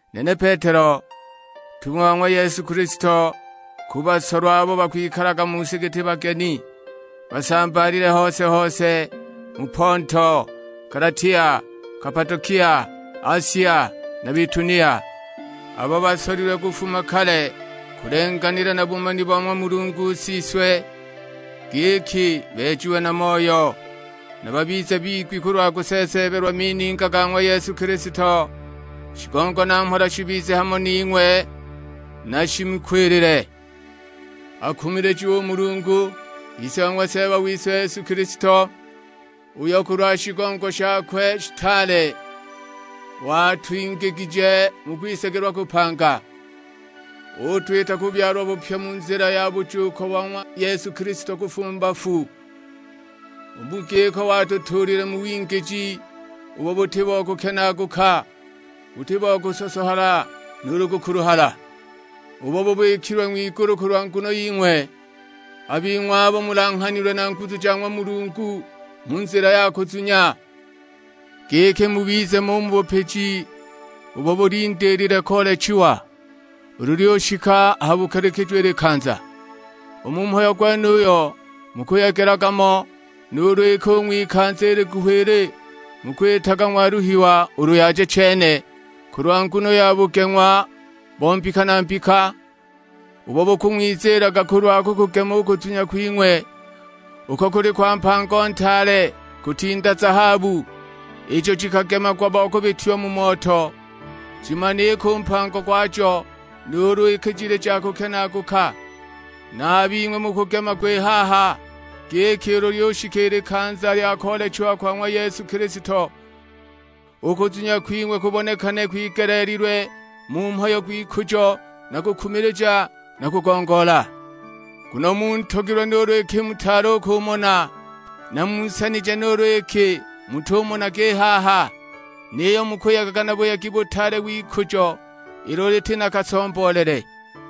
Nene Petelo ntung'wa wa ng'wa Yesu Kilisto: ku basolwa abo bakwikalaga mu si giti bageni, basambaalile hose-hose mu Ponto, Galatia, Kapadokia, Asia, na Bitunia; abo basolilwe kufuma kale kulenganila na bumani bo ng'wa Mulungu Siswe, giki beejiwe na Moyo; na babize bigwi kulwa kuseeseebelwa mininga ga ng'wa Yesu Kilisto. Shigongo na mhola shibize hamo ning'we na shimukwilile. Akumilijiwe u Mulungu, Ise wa ng'wa Seeba wise Yesu Kilisto; uyo kulwa shigongo shakwe shitaale watwingigije mu kwisagilwa kupanga, utwita kubyalwa bupya mu nzila ya bujuuko bo ng'wa Yesu Kilisto kufuma mu bafu. U mu giko watutuulile mu wingiji ubo buti bo kukenaaguka, buti bo kusosohala nuulu kukuluhala. Ubo bubikilwe ng'wigulu kulwa nguno ying'we; a bing'we abo mulanghanilwe na nguzu ja ng'wa Mulungu mu nzila ya kuzunya; giki mubize mo u mu bupiji ubo bulindiilile koolechiwa, ulu lyushika ha bukalikijo i likanza. U mu mhayo gwenuyo mukuyegelaga mo, nuulu iki u ng'wikanza i liguhi ili mukwitaga ng'waluha ulu yaja chene, kulwa nguno ya bugeng'wa bo mbika na mbika, ubo bukung'wiziilaga kulwa kukugema u kuzunya kwing'we, uko kuli kwa mpango ntaale, kutinda zahabu, ijo jikagemagwa bo kubitiwa mu moto, jimanike u mpango gwajo, nuulu iki jili ja kukenaaguka. Na a bing'we mukugemagwa i haha, giki ulu lyushika i likanza lya koolechiwa kwa ng'wa Yesu Kilisto, u kuzunya kwing'we kubonekane kwigeleelilwe mu mhayo gw'ikujo na kukumilija na kugongoola. Nguno muntogilwe nuulu iki mutaali u kumona, na munsanije nuulu iki mutumonaga i haha. Niyo mukuyegaga na buyegi butaale w'ikujo ilo liti na kasomboolele.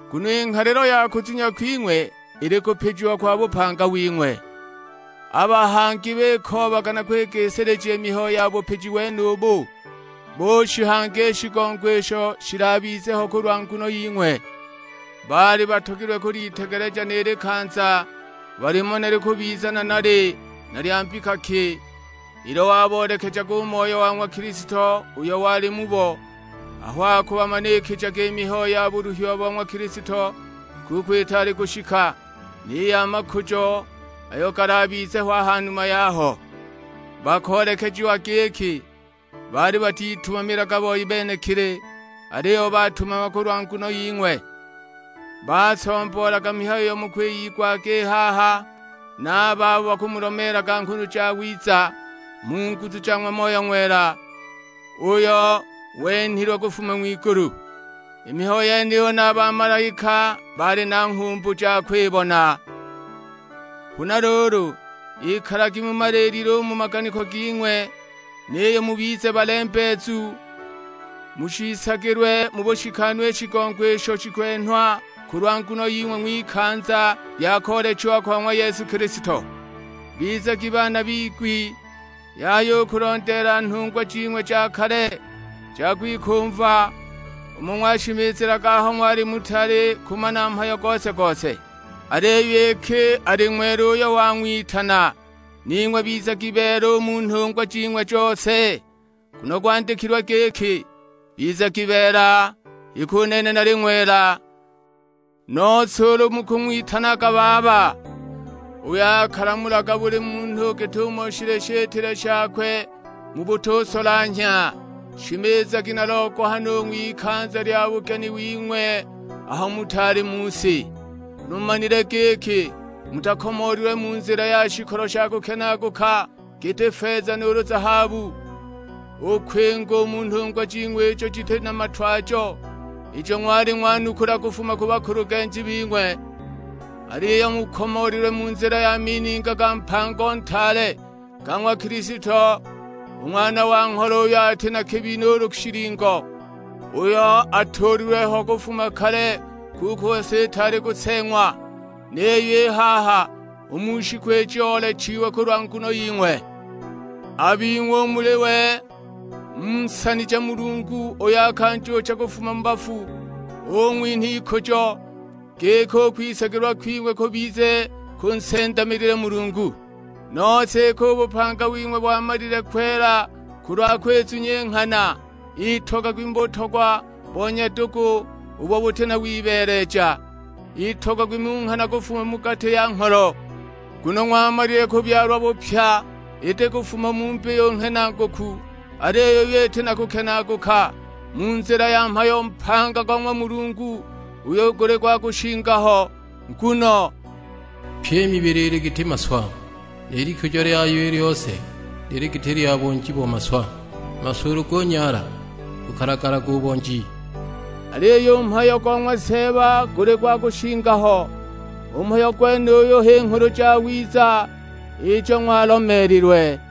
Nguno i nghalilo ya kuzunya kwing'we ili kupijiwa kwa bupanga wing'we. A bahangi bikoobaga na kwigisilija i mihayo ya bupiji wenubu; bushihanga i shigongo isho shilabize ho kulwa nguno ying'we. Baali batogilwe kulitegeleja ni likanza, balimane likubiza nanali na lya mbika ki, ilo waboolekejaga u Moyo wa ng'wa Kilisto uyo wali mubo, aho akubamanikijaga i mihayo ya buluhiwa bo ng'wa Kilisto, kuko itaali kushika, ni ya makujo ayo galabize ho a ha numa yaho. Bakoolekejiwa giki baali batitumamilaga boi benekili, aliyo batumamaga kulwa nguno ying'we. Basomboolaga mihayo iyo mukuwilagwa i haha na a babo bakumulomeelaga Nghulu Jawiza, mu nguzu ja ng'wa Moyo Ng'wela, uyo wenhilwe kufuma ng'wigulu. I mihayo yeniyo na a bamalaika bali na nghumbu ja kwibona. Huna luulu, ikalagi mumaliilile u mu maganiko ging'we, niyo mubize balembeezu; mushiisagilwe mu bushikanu i shigongo isho shikwenhwa kulwa nguno ying'we ng'wikanza lya koolechiwa kwa ng'wa Yesu Kilisto. Bizagi baana bigwi, yaya u kulondeela nhungwa jing'we ja kale, ja kwikumva; umo ng'washimizilaga aho ng'wali mutaali kumana mhayo gose-gose. Aliyo iki ali ng'wela uyo wang'witana, ning'we bizagi beela u mu nhungwa jing'we jose. Nguno gwandikilwe giki, "Bizagi beela iki u nene nali ng'wela." Nose ulu mukung'witanaga Baba, uyo akalamulaga buli munhu git'umo shili shitile shakwe mu butusolanhya, shimizagi na logohano u ng'wikanza lya bugeni wing'we aho mutaali mu si. Nguno mumanile giki mutakomoolilwe mu nzila ya shikolo sha kukenaaguka, giti: feza nuulu zahabu, u kwinga u mu nhungwa jing'we ijo jiti na matwajo, ijo ng'wali ng'wanukula kufuma ku bakulugenji bing'we. Aliyo mukomoolilwe mu nzila ya mininga ga mpango ntaale, ga ng'wa Kilisto, u Ng'wana wa Ngholo uyo ati na kabi nuulu shilingo, uyo atuulilwe ho kufuma kale kuko si itaali kuseeng'wa; niyo i haha u mu shiku iji oolechiwe kulwa nguno ying'we. A bing'we u muli we munsanije Mulungu uyo akanjuucha kufuma mu bafu; ung'winha ikujo, giki u kwisagilwa kwing'we kubize kunsendamilile Mulungu. Nose iki u bupanga wing'we wamalile kwela kulwa kwizunya i nghana, itogagwi mu butogwa bo nyadugu ubo buti na wibeeleja: itogagwi mu nghana kufuma mu gati ya ngholo. Nguno ng'wamalile kubyalwa bupya, iti kufuma mu mbiyu nghenaguku, aliyo iyo iti na kukenaaguka: mu nzila ya mhayo mpaga go ng'wa Mulungu, uyo guli gwa kushinga ho. Nguno, "Pyi i mibili ili giti maswa, ni likujo lyayo i lyose lili giti lya bonji bo maswa; a maswa ulu gunyaala bukalagalaga u bonji." Aliyo u mhayo go ng'wa Seeba guli gwa kushinga ho. U mhayo gwenuyo h'i Nghulu Jawiza ijo ng'walomeelilwe.